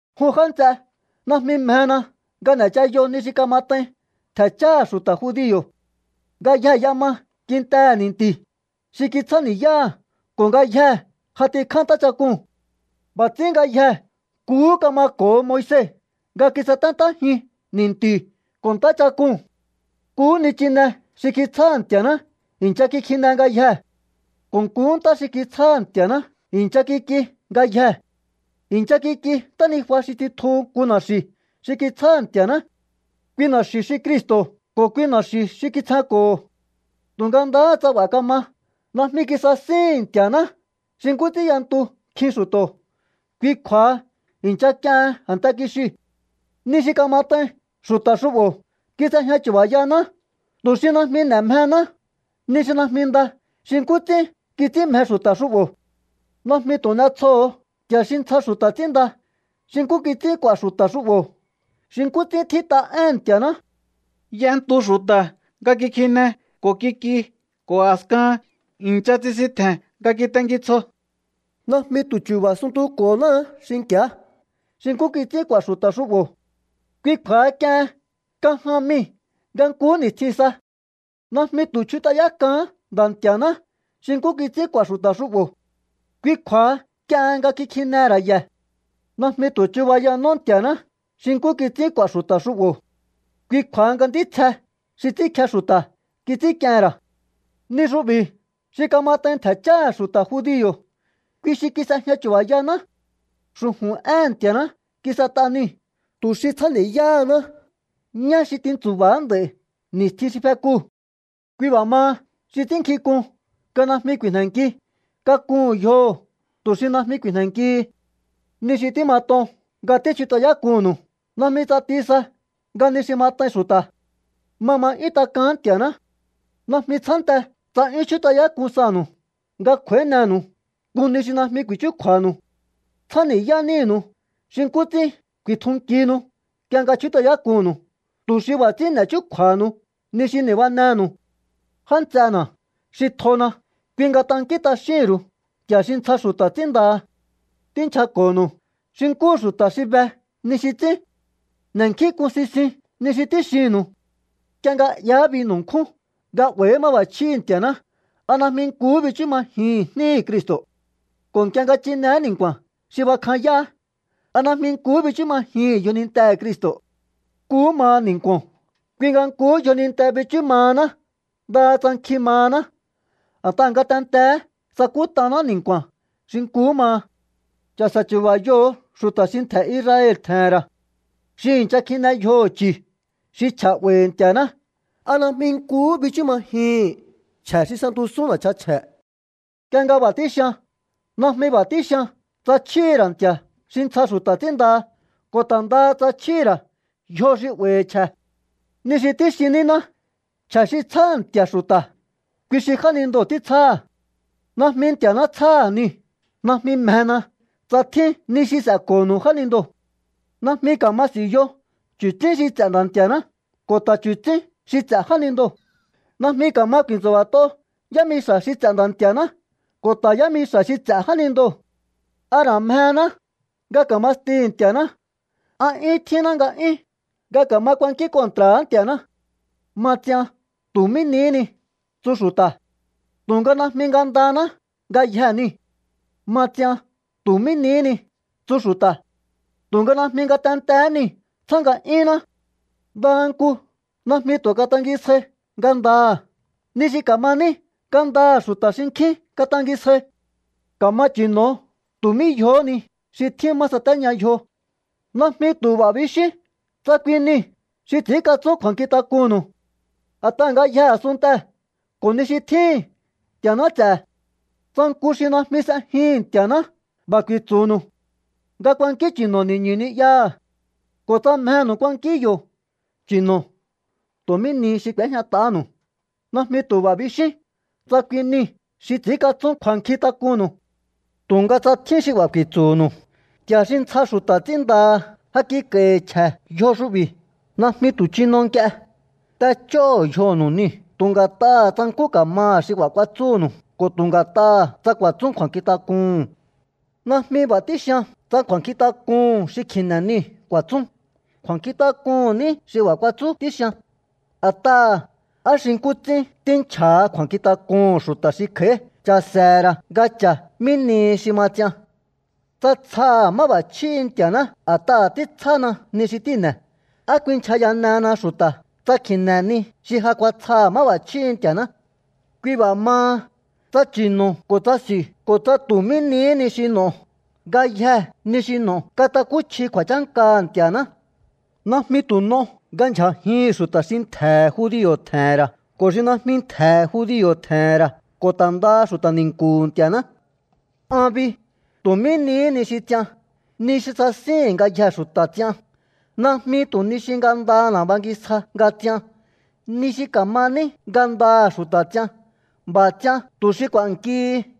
Jun já nts'e, najmi mjena nga n'e̱chayo ni xi kamat'ain ntje̱ cháha̱ xu̱ta̱ judio̱. Ngayjee̱ y'ema kintehe̱ ni̱nti̱ xi kitsjáni̱yáha̱ ko̱ ngayjee̱ j'atikjá ntáchak'uu̱n. B'a̱ ts'ín ngayjee̱ nkuhú kamako̱ho Moise nga kisaténtájin ni̱nti̱u̱ ko̱ ntáchak'uu̱n. Nkuhú nichine xi kitsjáha̱ Nti̱a̱ná i̱ncha kikjine ngayjee̱ ko̱ nkuhú ntá xi kitsjáha̱ Nti̱a̱ná i̱ncha kik'i ngayjee̱. I̱ncha kik'i ntánijua xi tsitjuhu̱ nku na̱xi̱ xi kitsjáha̱ Nti̱a̱ná. Kui na̱xi̱u̱ xi Cristo̱ ko̱ kui na̱xi̱u̱ xi kitsjenko̱ho̱. Tu̱nga ndaha tsa b'a̱ kama, najmi kisasíhi̱n Nti̱a̱ná xi nkú ts'ín y'entu nkjin xu̱to̱. Kui kju̱a̱ha i̱ncha k'iehen a̱nte kixiu̱. Ni xi kamat'ain xu̱ta̱ xu'bo̱ kis'ejña chu̱ba̱yaná, tu̱ xi najmi n'e̱ mjehená ni xi najmi nda xi nkú ts'ín kits'ín mje xu̱ta̱ xu'bo̱. Najmi tu̱ n'e̱tsjoho̱o nti̱a̱ xi ntsja xu̱ta̱ ts'ínnda xi nkú kits'ín k'u̱a̱ xu̱ta̱ xu'bo̱, xi nkú ts'ín tjít'a éhe̱n Nti̱a̱ná: “Y'entu xu̱ta̱ nga kikjine ko̱ kik'i ko̱ a̱skahan i̱ncha tsisintje̱n nga kitenki tsjo.” Najmi tu̱ chu̱ba̱ suntuko̱náá xinki̱á xi nkú kits'ín k'u̱a̱ xu̱ta̱ xu'bo̱. Kui kju̱a̱ha k'iehen kan jan mii̱ nga nkuhú ni̱stjin sa. Najmi tu̱ chjut'ayák'aán Nda̱ Nti̱a̱ná xi nkú kits'ín k'u̱a̱ xu̱ta̱ xu'bo̱. Kui kju̱a̱ha k'iehen nga kikjinehe̱ ra̱ ye̱. Najmi tu̱ chubayanó Nti̱a̱ná xi nkú kits'ín k'u̱a̱ xu̱ta̱ xu'bo̱. Kui kju̱a̱ha nga ntítsje xi ts'ínkje xu̱ta̱ kits'ínk'iehe̱n ra̱. Ni xu'bi̱ xi kamat'ain ntje̱ cháha̱ xu̱ta̱ judio̱, kui xi kis'ejña chu̱ba̱yaná. Xu̱ju̱n éhe̱n Nti̱a̱ná kis'et'a niu̱ tu̱ xi tsjáni̱yáhaná ñá xi tintsu̱ba̱á nd'a̱i̱ ni̱stjin xi fekuu̱. Kui b'a̱ maha, xi ts'ínnkjink'un nga najmi ku̱i̱jne̱nki, kakuhu̱n yjoho̱ tu̱ xi najmi ku̱i̱jne̱nkihi. Ni xi tímat'on nga tíchjut'ayák'unnu̱u najmi ts'ati sa nga ni xi mat'ain xu̱ta̱. Ma ma 'yún tak'aán Nti̱a̱ná. Najmi tsjánte tsa 'yún chjút'ayák'un sanu̱u nga kj'u̱a̱ínenu̱u nku ni xi najmi ku̱i̱chjúkju̱a̱nu̱u. Tsjáni̱yá nínu̱u xi nkú ts'ín ku̱i̱tjunkihinu nk'ie nga chjút'ayák'unnu̱u, tu̱ xi b'a̱ ts'ín n'e̱ chúkju̱a̱hanu ni xi ni̱banenu̱u. Já nts'ena̱ xi tjona̱, kui nga tankín t'axíhi̱n ru̱u nti̱a̱ xi ntsja xu̱ta̱ ts'ínndaha. Tínchjako̱nu̱u xi nkúhu xu̱ta̱ xi be ni xi ts'ín. N'e̱nkjínk'un sisiun ni xi tíxinnu̱u. Nk'ie nga 'yaá binu̱ nkjúu̱n nga 'ba̱i̱hi̱í máb'a̱chjíhi̱ Nti̱a̱ná, ¿a najmi nkuhú bichú majihi̱ín jníhi̱ Cristo̱? Ko̱ nk'ie nga chineé ni̱nku̱a̱n xi bakjanyáá, ¿a najmi nkuhú bichú majihi̱ín yjonintehe̱ Cristo̱? Nkuhú maha ni̱nku̱o̱n, kui nga nkuhú yjoninte bichú mahaná ndaha tsa nkjin mahaná. A̱t'aha̱ ngatenteé sakút'aná ni̱nku̱a̱n xi nkuhú maha. Cha̱se̱ chu̱ba̱yoho̱o xu̱ta̱ xi ntje̱ Israel tje̱he̱n ra̱. Xi i̱ncha kjine yjoho̱ chu̱ xi chje̱ 'ba̱i̱hi̱ Nti̱a̱ná, ¿a najmi nkuhú bichú majihi̱n chje̱ xi s'entusún na̱chan chje̱? Nk'ie nga b'a̱ tíxian, najmi b'a̱ tíxian tsa chjíhi̱ ra̱ nti̱a̱ xi ntsja xu̱ta̱ ts'ínndaha ko̱ ta̱ ndaha tsa chjíhi̱ ra̱ yjo xi 'ba̱i̱hi̱ chje̱. Ni xi tíxin níná, chje̱ xi tsjáha̱ nti̱a̱ xu̱ta̱, kui xi jánindoo̱ títsjáha̱. Najmi Nti̱a̱ná tsjáha̱ niu̱. Najmi mjena tsa tjín ni xi s'e̱ko̱nu̱u jánindoo̱. Najmi ka̱ma s'i̱u̱yo chu̱tsín xi ts'e̱ Nda̱ Nti̱a̱ná ko̱ ta̱ chu̱tsín xi ts'e̱ jánindoo̱. Najmi ka̱ma ku̱i̱ntsu̱ba̱t'o yámixa̱ xi ts'e̱ Nda̱ Nti̱a̱ná ko̱ ta̱ yámixa̱ xi ts'e̱ jánindoo̱. ¿A ra̱ mjehéná nga ka̱ma stihi̱ Nti̱a̱ná? ¿A 'yúhún tjínná nga'yún nga ka̱ma ku̱a̱nkín kontra̱á Nti̱a̱ná? “Ma ts'ian tu̱ mí nihí ni”, tsu xu̱ta̱. Tu̱nga najmi ngandanáhá ngayjee̱ niu̱. “Ma ts'ian tu̱ mí nihí ni”, tsu xu̱ta̱. Tu̱nga najmi ngatentee̱hé niu̱ tsjá nga'yúnná. Ndaha nku najmi tu̱ katangisjai ngandaha̱. Ni xi ka̱ma ní ngandaha̱ xu̱ta̱ xinkjín katangisjai. Ka̱ma chi̱no̱o tu̱ mí yjohó ni xi tjín má satéña yjo. Najmi tu̱ b'a̱ bixíún tsa kui niu̱ xi ts'i̱ínkatsún kju̱a̱nkjintak'unnu̱u. A̱t'aha̱ ngayjee̱ a̱sunntee̱ ko̱ ni xi tjíhi̱n, Nti̱a̱ná ts'e̱. Tsa nku xi najmi s'ejihi̱n Nti̱a̱ná b'a̱ ku̱i̱tsu̱nu̱u nga kuankín chi̱no̱o ni̱ñu̱ ni'yaha̱ ko̱ tsa mjenu̱u kuankíún yo̱, chi̱no̱o tu̱ mí ni xi k'u̱éjñat'ahánu̱u. Najmi tu̱ b'a̱ bixíún tsa kui niu̱ xi ts'i̱ínkatsún kju̱a̱nkjintak'unnu̱u. Tu̱nga tsa tjín xi b'a̱ ku̱i̱tsu̱nu̱u: “Nti̱a̱ xi ntsja xu̱ta̱ ts'ínndaha ja kik'a̱i̱hi̱ chje̱ yjo xu'bi̱”, najmi tu̱ chino nk'ie. T'ech'óho̱o yjonu̱u niu̱ tu̱ nga̱t'aha̱ tsa nkú ka̱maha̱ xi b'a̱ kuatsúnu̱u ko̱ tu̱ nga̱t'aha̱ tsa ku̱a̱tsún kju̱a̱nkjintak'uhu̱n. Najmi b'a̱ tíxian tsa kju̱a̱nkjintak'uhu̱n xi kji̱ne̱ niu̱ ku̱a̱tsún. Kju̱a̱nkjintak'un níhi̱ xi b'a̱ kuatsúu̱ tíxian. A̱t'aha̱, ¿á xi nkú ts'ín tínchja̱ha kju̱a̱nkjintak'uhu̱n xu̱ta̱ xi kj'a̱í cha̱se̱he̱ ra̱ nga cha̱ mí nihi xi ma ts'ian? Tsa tsjaha̱ máb'a̱chjíhi̱ Nti̱a̱ná a̱t'aha̱ títsjána ni xi tíi̱ne̱, ¿á ku̱i̱nchja̱yanehena xu̱ta̱ tsa kjíne̱ ni xi ja kuatsjaha̱ máb'a̱chjíhi̱ Nti̱a̱ná? Kui b'a̱ maha, tsa chi̱no̱o ko̱ tsa s'i̱u ko̱ tsa tu̱ mí nihí ni xi n'o̱o, ngayje ni xi n'o̱o katakúchji kju̱a̱chánkaha̱ Nti̱a̱ná. Najmi tu̱ n'o nga ndyja̱jihi̱n xu̱ta̱ xi ntje̱he̱ judio̱ tje̱he̱n ra̱ ko̱ xi najmi ntje̱he̱ judio̱ tje̱he̱n ra̱ ko̱ ta̱ ndaha xu̱ta̱ ni̱nku̱hu̱ Nti̱a̱ná. An bi, tu̱ mí nihí ni xi ts'ian, ni xi sasíhi̱n ngayjee̱ xu̱ta̱ ts'ian. Najmi tu̱ ni xi ngandana̱ bangisja nga ts'ian. Ni xi ka̱ma ní ngandaha̱ xu̱ta̱ ts'ian. B'a̱ ts'ian tu̱ xi k'u̱a̱nkihi.